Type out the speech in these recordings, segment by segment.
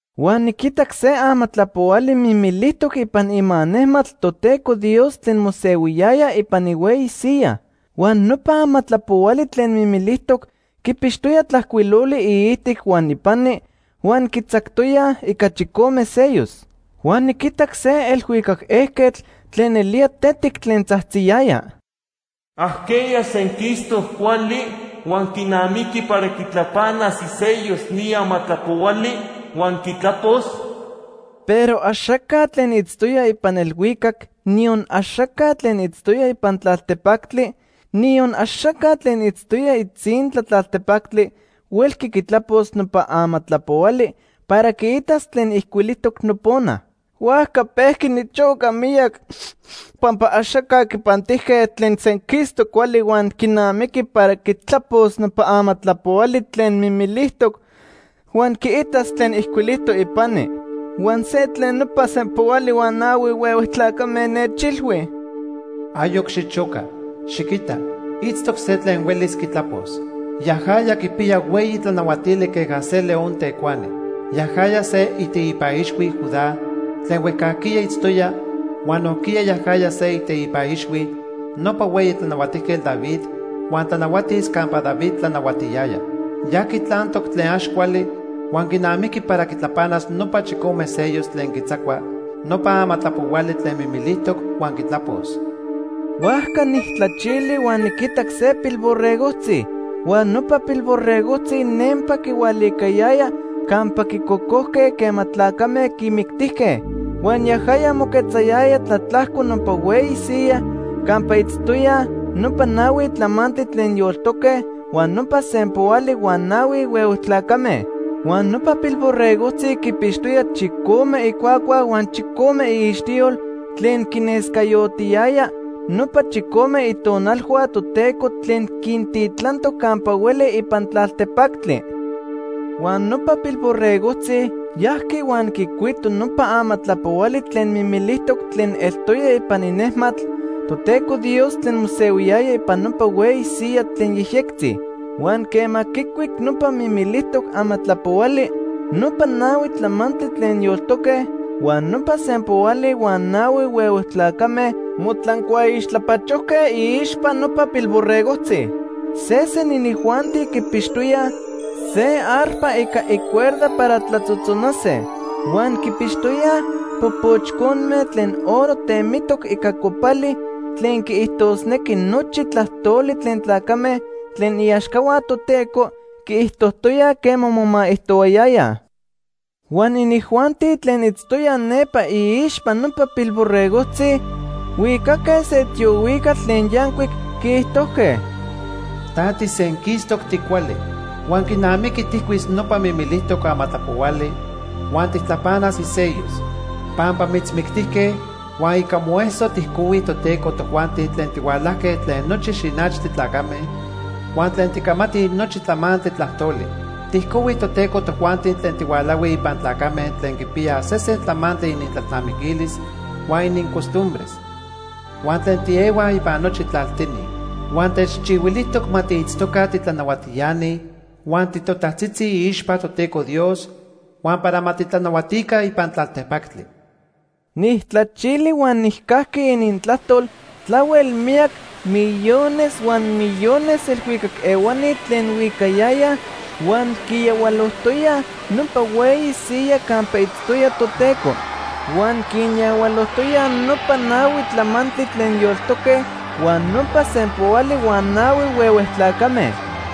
Huan niquitac se amatlapohuali mimilijtoc ipan ima nejmatl Toteco Dios tlen mosehuiyaya ipan ihueyi siyaj. Huan nopa amatlapohuali tlen mimilijtoc quipixtoya tlajcuiloli iijtic huan ipani huan quitzactoyaj ica chicome sellos. Huan niquitac se elhuicac ejquetl tlen nelía tetic tlen tzajtziyaya: “¿Ajqueya senquistoc cuali huan quinamiqui para quitlapanas isellos ni amatlapohuali huan quitlapos?” Pero axaca tlen itztoya ipan elhuicac, niyon axaca tlen itztoya ipan tlaltepactli, niyon axaca tlen itztoya itzintla tlaltepactli huelqui quitlapos nopa amatlapohuali para quiitas tlen ijcuilijtoc nopona. Huajca pejqui nichoca miyac pampa axaca quipantijque tlen senquistoc cuali huan quinamiqui para quitlapos nopa amatlapohuali tlen mimilijtoc huan quiitas tlen ijcuilijtoc ipani. Huan se tlen nopa sempoali huan nahui huehue tlacame nechilhui: “Ayoc xichoca. Xiquita, itztoc se tlen huelis quitlapos. Yajaya quipiya hueyi tlanahuatili queja se león tecuani. Yajaya se iteipa ixhui Judá tlen huejcajquiya itztoya huan nojquiya yajaya se iteipa ixhui nopa hueyi tlanahuatijquetl David huan tlanahuatis campa David tlanahuatiyaya. Ya quitlantoc tlen ax cuali huan quinamiqui para quitlapanas nopa chicome sellos tlen quitzacua nopa amatlapohuali tlen mimilijtoc huan quitlapos.” Huajca nijtlachili huan niquitac se Pilborregojtzi. Huan nopa Pilborregojtzi nempa quihualicayaya campa quicocojque quema tlacame quimictijque. Huan yajaya moquetzayaya tlatlajco nopa hueyi siyaj campa itztoyaj nopa nahui tlamantli tlen yoltoque huan nopa sempoali huan nahui huehue tlacame. Huan nopa Pilborregojtzi quipixtoya chicome icuacua huan chicome iixtiyol tlen quinescayotiyaya nopa chicome Itonalhua Toteco tlen quintitlantoc campa hueli ipan tlaltepactli. Huan nopa Pilborregojtzi yajqui huan quicuito nopa amatlapohuali tlen mimilijtoc tlen eltoya ipan inejmatl Toteco Dios tlen mosehuiyaya ipan nopa hueyi siyaj tlen yejyectzi. Huan quema quicuic nopa mimilijtoc amatlapohuali, nopa nahui tlamantli tlen yoltoque huan nopa sempoali huan nahui huehue tlacame motlancuaixtlapachojque iixpa nopa Pilborregojtzi. Sesen inijuanti quipixtoyaj se arpa ica icuerda para tlatzotzonase. Huan quipixtoyaj popochconme tlen oro temitoc ica copali tlen quiijtosnequi nochi tlajtoli tlen tlacame tlen iaxcahua Toteco quiijtojtoyaj quema momaijtoyayaj. Huan inijuanti tlen itztoyaj nepa iixpa nopa Pilborregojtzi huicaque se tiohuicatl tlen yancuic, quiijtojque: “Ta tisenquistoc ticuali. Huan quinamiqui tijcuis nopa mimilijtoc amatlapohuali huan tijtlapanas isellos. Pampa mitzmictijque huan ica moeso tijcohui Toteco tojuanti tlen tihualajque tlen nochi xinachtli tlacame, huan tlen ticamatij nochi tlamantli tlajtoli. Tijcohui Toteco tojuanti tlen tihualahuij ipan tlacame tlen quipiyaj sesen tlamantli inintlalnamiquilis huan inincostumbres, huan tlen tiehuaj ipan nochi tlaltini. Huan techchihuilijtoc ma tiitztoca titlanahuatiani huan titotajtzitzi iixpa Toteco Dios, huan para ma titlanahuatica ipan tlaltepactli.” Nijtlachili huan nijcajqui inintlajtol tlahuel miyac millones huan millones elhuicac ehuani tlen huicayayaj huan quiyahualojtoyaj nopa hueyi siyaj campa itztoya Toteco. Huan quinyahualojtoyaj nopa nahui tlamantli tlen yoltoque huan nopa sempoali huan nahui huehue tlacame.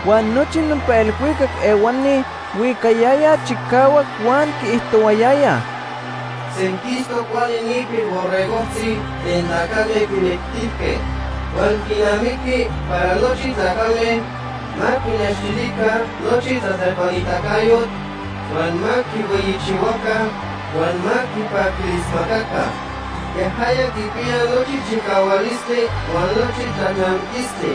Huan nochi nopa elhuicac ehuani huicayayaj chicahuac huan quiijtohuayayaj: “Senquistoc cuali ni Pilborregojtzi tlen tlacame quimictijque. Huan quinamiqui para nochi tlacame ma quinextilica nochi tlatlepanitacayotl, huan ma quihueyichihuaca huan ma quipaquilismacaca. Yajaya quipiya nochi chicahualistli huan nochi tlalnamiquistli.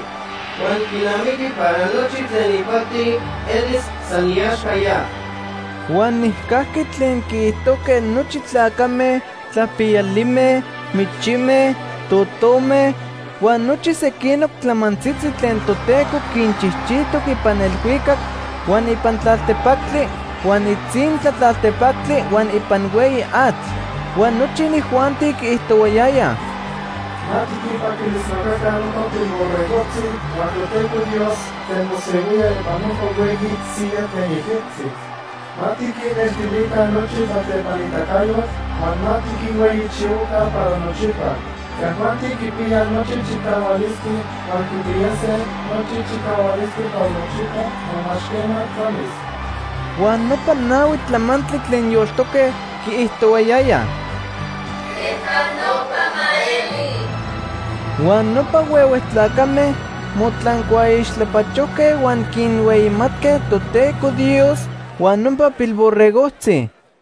Huan quinamiqui para nochi tlen ipati elis san iaxca ya.” Huan nijcajqui tlen quiijtojque nochi tlacame, tlapiyalime, michime, totome, huan nochi sequinoc tlamantzitzi tlen Toteco quinchijchijtoc ipan elhuicac, huan ipan tlaltepactli, huan itzintla tlaltepactli, huan ipan hueyi atl. Huan nochi inijuanti quiijtohuayayaj: “Ma tiquinpaquilismacaca nopa Pilborregojtzi huan Toteco Dios tlen mosehuía ipan nopa hueyi siyaj tlen yejyectzi. Ma tiquinnextilica nochi tlatlepanitacayotl, huan ma tiquinhueyichihuaca para nochipa. Yajuanti quipiyaj nochi chicahualistli huan quipiyase nochi chicahualistli para nochipa huan ax quema tlamis.” Huan nopa nahui tlamantli tlen yoltoque quiijtohuayayaj: “¡Queja nopa ma eli!” Huan nopa huehue tlacame motlancuaixtlapachojque huan quinhueyimatque Toteco Dios huan nopa Pilborregojtzi.